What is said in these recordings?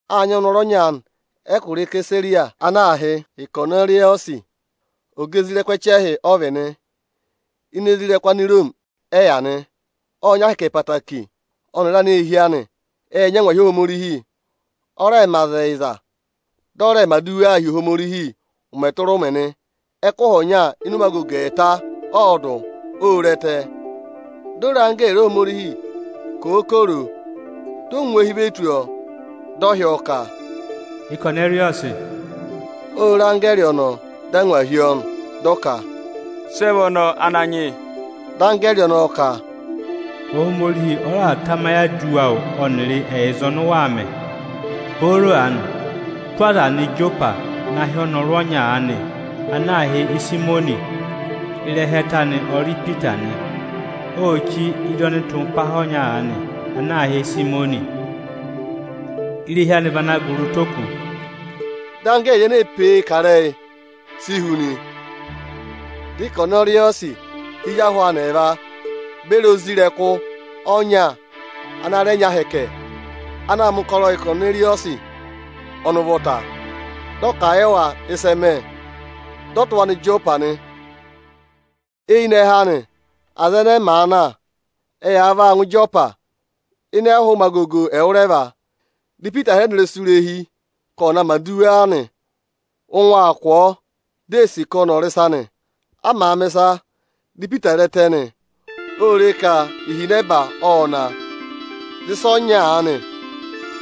Â nyị ọnọrụ ọnya aanị ẹkụra Isesariya ana aā hị́ Ịkọnẹrịyọsị. Ọga isoja ẹchẹhị nịnị ọ vị nị. Ini isoja nịnị Aniroomi ẹ yà nị. Ộ nyị ahẹkẹ ẹtẹẹtẹrẹ, ọnịrị aneehi anị ệ nyị angwahi Ohomorihi. Ọ rẹẹ̄ mẹ aza ẹyịza, dị ọ rẹẹ̄ mẹ̀ aduwaa hi Ohomorihi ụmẹ tụra ụmẹ nị. Ẹkụhị ọnya ịnị ụmẹ agogo ẹẹta ọọdụ, ô re ẹtẹ. Di o re anggẹẹrị Ohomorihi, dị ọ ngụ eehi ve tù ọọ, dị ọ hị́ ọọ ka, “Ịkọnẹrịyọsị!” Ô re anggẹẹrị ọnọọ, dị angwa hí ọọ nị. Dị ọ ka, “Sị ẹ vị ọnọọ, Ananyị yị?” Dị anggẹẹrị ọnọọ ka, “Ohomorihi ọ raà tamayị aduwa awụ ọnịrị ẹyịza ọnị ụ waa mẹ. Booro aanị, tụ́ aza nọ Ịjọpa na hị́ ọnọrụ ọnya aanị ana aā hị́ Ịsayịmọnị, ịrẹha ẹtẹ anị ọ rị Ipita nị. Ô chí ị́dị ọnịtụmpaha ọnya aanị ana aā hị́ Ịsayịmọnị. Irehi anị vị ana gụrị ụtọ oku.” Dị anggẹẹrị ene ee pe e kà ịrẹyị, si hu nị. Dị Ịkọnẹrịyọsị hị́ ezi ahụ anị ẹẹva beri isoja ọnya ana rẹ nyị ahẹkẹ, ana aa mẹ̀ ụkọrọ yị Ịkọnẹrịyọsị ọnị ụvọta. Dị ọ kà a yị wa ịsị ẹ mẹ, dị ọ tụ́ wa aa nọ Ịjọpa nị. Eyinẹhẹ anị, aza ẹnẹẹ màa na, ẹyaa vaa ngụ Ịjọpa. Ịnị ẹhụụ ụmẹ agogo ẹwụrẹva, dị Ipita hịrẹ nọ ịrẹsụ irehi ka ọnị ọ̀ na mẹ̀ aduwa nị. Ụngwẹ aa kụ̀ ọọ, di ee sì ka ọnị ọ̀ rị ịsa nị. A màa mẹ̀ ịsa, dị Ipita re ẹtẹ nị. Ô re ka ihinẹba ộ na, dị ịsa ọnya aanị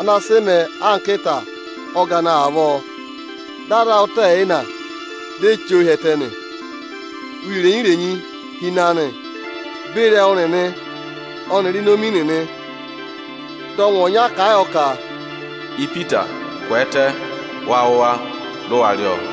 ana sị mẹẹ anka ịta ọgana avọọ, dị a za a ụtọ ẹyịna, di ee chí ọọ hi ẹtẹ nị. Uye irenyi-irenyi hi ịnị anị beri ẹwụ nịnị ọnịrị inomi nịnị. Dị ọngwẹ ọnya kà a yọ ka, “Ipita, kwẹẹtẹ, wa wụ̀ wa, dị waa rị ọọ!”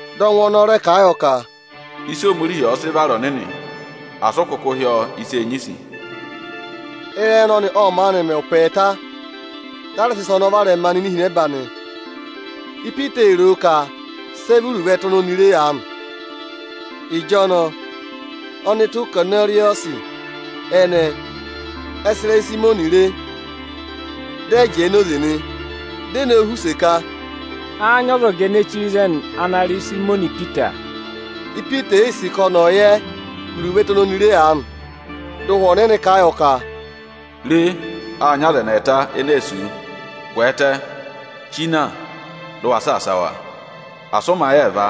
Dị ọngwẹ ọnọọ rẹ kà a yọ ka, “Ịsị Ohomorihi ọ̀ọ sị vara ọnịnị, asị ụ kụkụ hị́ ọọ ịsa ene du ẹngụ.” Ịrẹyị ọnọnị ộ maanị mẹ ụpẹ ẹẹta, dị a rẹ sị ịsa ọnọọ varẹma nọ ini ihinẹba nị. Ipita ee ro o ka sị ẹ vị iruvo ẹtẹ oni oni re aanị. Ịjọnọọ ọnụtụ Ịkọnẹrịyọsị ẹnẹẹ ẹ sị irehi Ịsayịmọnị re, dị ẹ jẹẹ enoze nị. Di e nowu họ̀ use ka, “Áá nyị ọzọga ene chí ịzẹnị ana rị Ịsayịmọnị Ipita?” Ipita ee yii sì ka ọnị ọ̀ yẹ iruvo ẹtẹ oni oni re aanị, dị Ụhwẹ Ọnịnị kà a yọ ka, “Re, â nyị aza ẹnị ẹẹta ene ee sì wu. Kwẹẹtẹ, chí na, dị ụ wa saasa wa! Asị ụ mẹ ayị ẹẹva,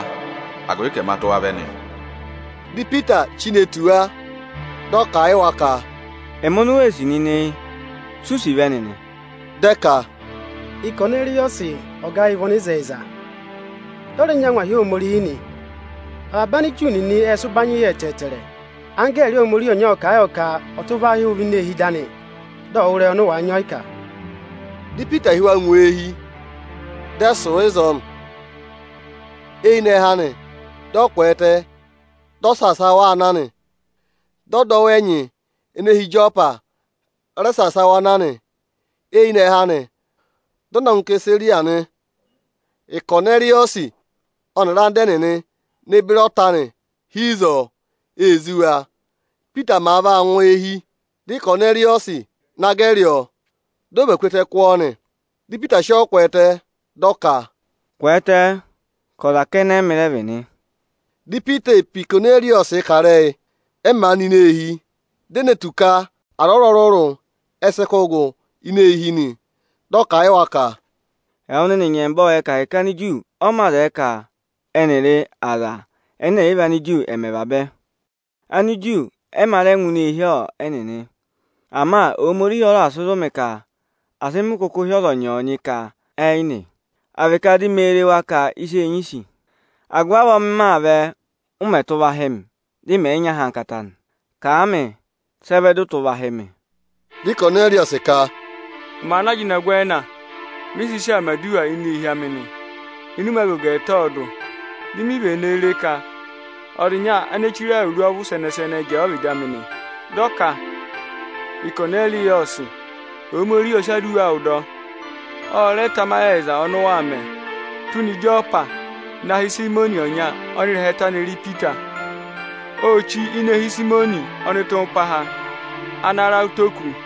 agụvị ka ẹma tụ́ wa vẹ nị!” Dị Ipita chí ne tù wa, dị ọ kà a yị wa ka, “Ẹmị oni u wee sì nịnị yị. Si u sì vẹ nịnị?” Dị ẹ ka, “Ịkọnẹrịyọsị ọga ayị vị ọnịzẹyịza, dị ọ rẹ nyị angwahi Ohomorihi nị. Avaba Aniju nịnị ệ sị ụbanyị yọ ẹtẹẹtẹrẹ. Anggẹẹrị Ohomorihi ọnya ộ kà a yọ ka ọ̀ tụ́ hị́ wụ vẹ ini eehi ịdị anị, dị ọ̀ wụ́ ịrẹyị ọnị ụ wàa nyị ọyịkà.” Dị Ipita hị́ wa ngụ eehi, dị ẹ sụ̀ ịzọọ nị. Eyinẹhẹ anị, dị ọ kwẹẹtẹ, dị ọ saasa wa aa na nị. Dị ọdọwụ ẹnyị ene hi Ịjọpa rẹ saasa wa na nị. Eyinẹhẹ anị, dị ọ na ngụ Isesariya nị. Ịkọnẹrịyọsị ọnịrị anda ẹnịnị ne beri ọta anị hi ịzọọ, ee zí wa. Ípita màa vaa ngụ eehi, dị Ịkọnẹrịyọsị na gẹrị ọọ, dị ọ và ku ẹtẹ kụ́ ọọ nị. Dị Ipita sị ọọ kwẹẹtẹ, dị ọ ka, “Kwẹẹtẹ, ka ọza kẹnẹ ẹ́mị rẹ vị nị.” Dị Ipita ee pe Ịkọnẹrịyọsị kà ịrẹyị, ẹ màa nọ ini eehi, di e ne tù ka aza ọrụrụ-ọrụrụ ẹ sị kụ́ gụ ini eehi nị. Dị ọ kà a yị wa ka, “Ẹwụ nịnị nyẹmba ộ yẹ ka ahẹkẹ Aniju ọ mā zẹẹ ka ẹnịrị Anigiriki ẹ̀ mẹ ẹvabẹ. Aniju ẹ mā rẹ ngụ ini eehi ẹnịnị. Ama Ohomorihi ọ raà sị zụ̀ mị ka asị mị kụkụ hị́ ọzọnyị-ọzọnyị ka ẹ yị nị, à vị ka di mee re wa anka ịsa eenyisi. Agụvị avọọ m maa vẹ, ụ mẹ̀ tụ́ va hị́ mị dị mẹ̀ yị nyị ahankata nị. Kà a mị sị ẹ vẹ dị ụ tụ́ va hị́ mị?” Dị Ịkọnẹrịyọsị ka, “Ụmẹ aanị ajịnọgwẹẹna mị sị sị aa mẹ̀ aduwa ini eehi amị nị, ịnị ụmẹ agogo ẹẹta ọọdụ. Di mi vene re ka ọza ịnya ene chire awuru ọvụ sẹnẹ-sẹnẹ jẹẹ ọ́vịdị amị nị. Dị ọ ka: ‘Ịkọnẹrịyọsị! Ohomorihi ọ sị aduwa awụ dọ. Ọ rẹ tamayị ẹyịza ọnị ụ waa mẹ. Tụ́ na Ịjọpa na hị́ Ịsayịmọnị ọnya, ọnị ịrẹha ẹtẹ anị rị Ipita. Ô chí ini eehi Ịsayịmọnị ọnịtụmpaha, ana ra ụtọ oku.’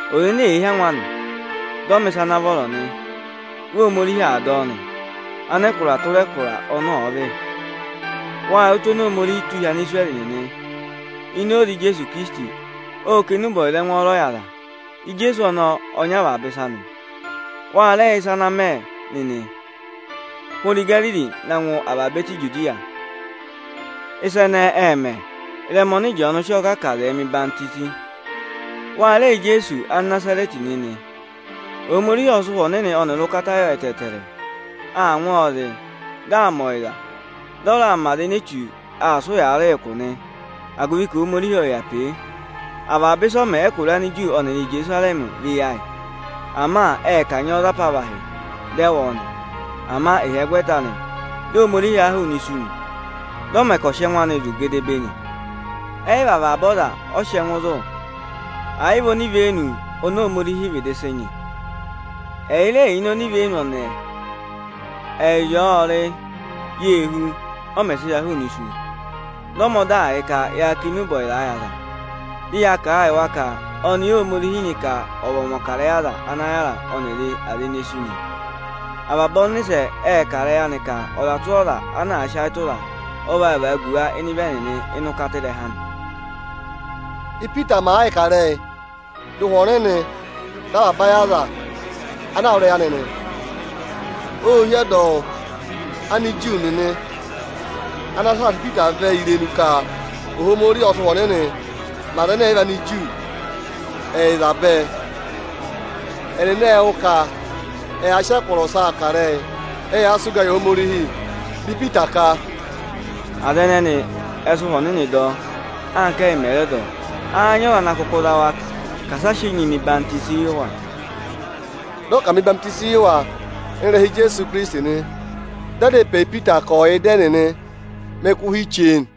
Ọza ene èe hí angwa anị, dị ọ mẹ̀ ịsa ana vọrọ nị, vị Ohomorihi aa dọ ọ nị, anẹkụra tụra anẹkụra ọnị ọ̀ọ vị. Wâ yẹ ụtụ oni Ohomorihi tụ́ hi Anisirẹrị nịnị. Ini oze Ijeesu Ikirisiti, ộ kà enube ọyịza ẹngwọọrọ yị aza. Ijeesu ọnọọ ọ nyị avaba ịsa nị. Wa rẹ yẹ ịsa ana mẹ nịnị, hụrẹ Igariri na ngụ avaba ẹtẹ Ijudiya. Ịsa ẹnẹẹ ệ mẹ ị́rẹma ọnị Ịjọọnụ sị ọọ kà ka aza ẹ̀ mẹ̀ ọyịhwọzenyi. Wa rẹ yẹ Ijeesu Anịnazarẹtị nịnị. Ohomorihi ộ sị Ụhwẹ Ọnịnị ọnịrị ụkata yọ ẹtẹẹtẹrẹ. Aa ngụ ọọ zị, dị aa mẹ ọyịza, dị ọ raa mẹ aza ene Echu aa sị ụyaa rị ụkụ nị, agụvị ka Ohomorihi ộ yà pe e. Avaba ịsị ọ mẹ ẹkụra Aniju ọnịrị Íjerusarẹmị vị eyi ayị. Ama ệ kanyị ọ za apavahị, dị ẹ wụ̀ ọ nị. Ama ịhyẹgwẹta anị, dị Ohomorihi ha a hụụnị isu nị. Dị ọ mẹ ka ọ̀ sị ẹngụ anị zụ̀ gedebee nị. Ẹ yị vị avaba aza ọ sị ẹngụ zụ̀, ẹ̀ yị vị onivenu oni Ohomorihi vịdị sị nyị. Ẹyị rẹ yà ini onivenu ẹnẹẹ. Ẹyịrị ọ ộ rị, yê hú, ọ mẹ̀ sị ha hụụnị isu. Dị ọ mẹ ọdaa yị ka ya kà enube ọyịza yị aza, dị ya kà a yị wa ka ọnị Óhomorihi nyị ka ọ̀ vị ọmọkarẹyị aza ana yàra ọnịrị aza ene sú nị. Avaba ọnịsẹ ệ kà ịrẹyị anị ka ọza tụra ọza ana àa sị ayị tụra a, ọ vaa vagu wa ịnị ịvị ẹnịnị ịnị ụkata ịrẹha anị.” Ípita màa yịị kà ịrẹyị, dị Ụhwẹ Ọnịnị dọ ayị avaba aza ana aa wụ́ ịrẹyị anị nị. Ô hí ọdọwụ Aniju nịnị ana saasa Ipita vẹ irenu ka Ohomorihi ộ sị Ụhwẹ Ọnịnị mẹ Anigiriki ẹyịza bẹẹ. Ẹnịnị ệ wụ́ ka ẹyaa sị ẹkụra ọsaa kà ịrẹyị, ẹyaa sị ụgaa yị Ohomorihi. Dị Ipita ka: “Aza ẹnẹnị ẹ sị Ụhwẹ Ọnịnị dọ, anka ẹ́yị mẹ̀ rẹ dọ; áá nyị ọza ana kụkụ zụ za wa ka asị a sị enyi mẹ Ọyịhwenyi ẹdọwụ yị wa?” Dị ọ ka à mẹ̀ ọyịhwọzenyi yị wa ịnị ịrẹha Ijeesu Ikirisiti nị. Dị ẹ dá ịpẹ yị Ipita ka ọ̀ yà ịdị ẹnịnị mẹ ẹkụhị chee nị.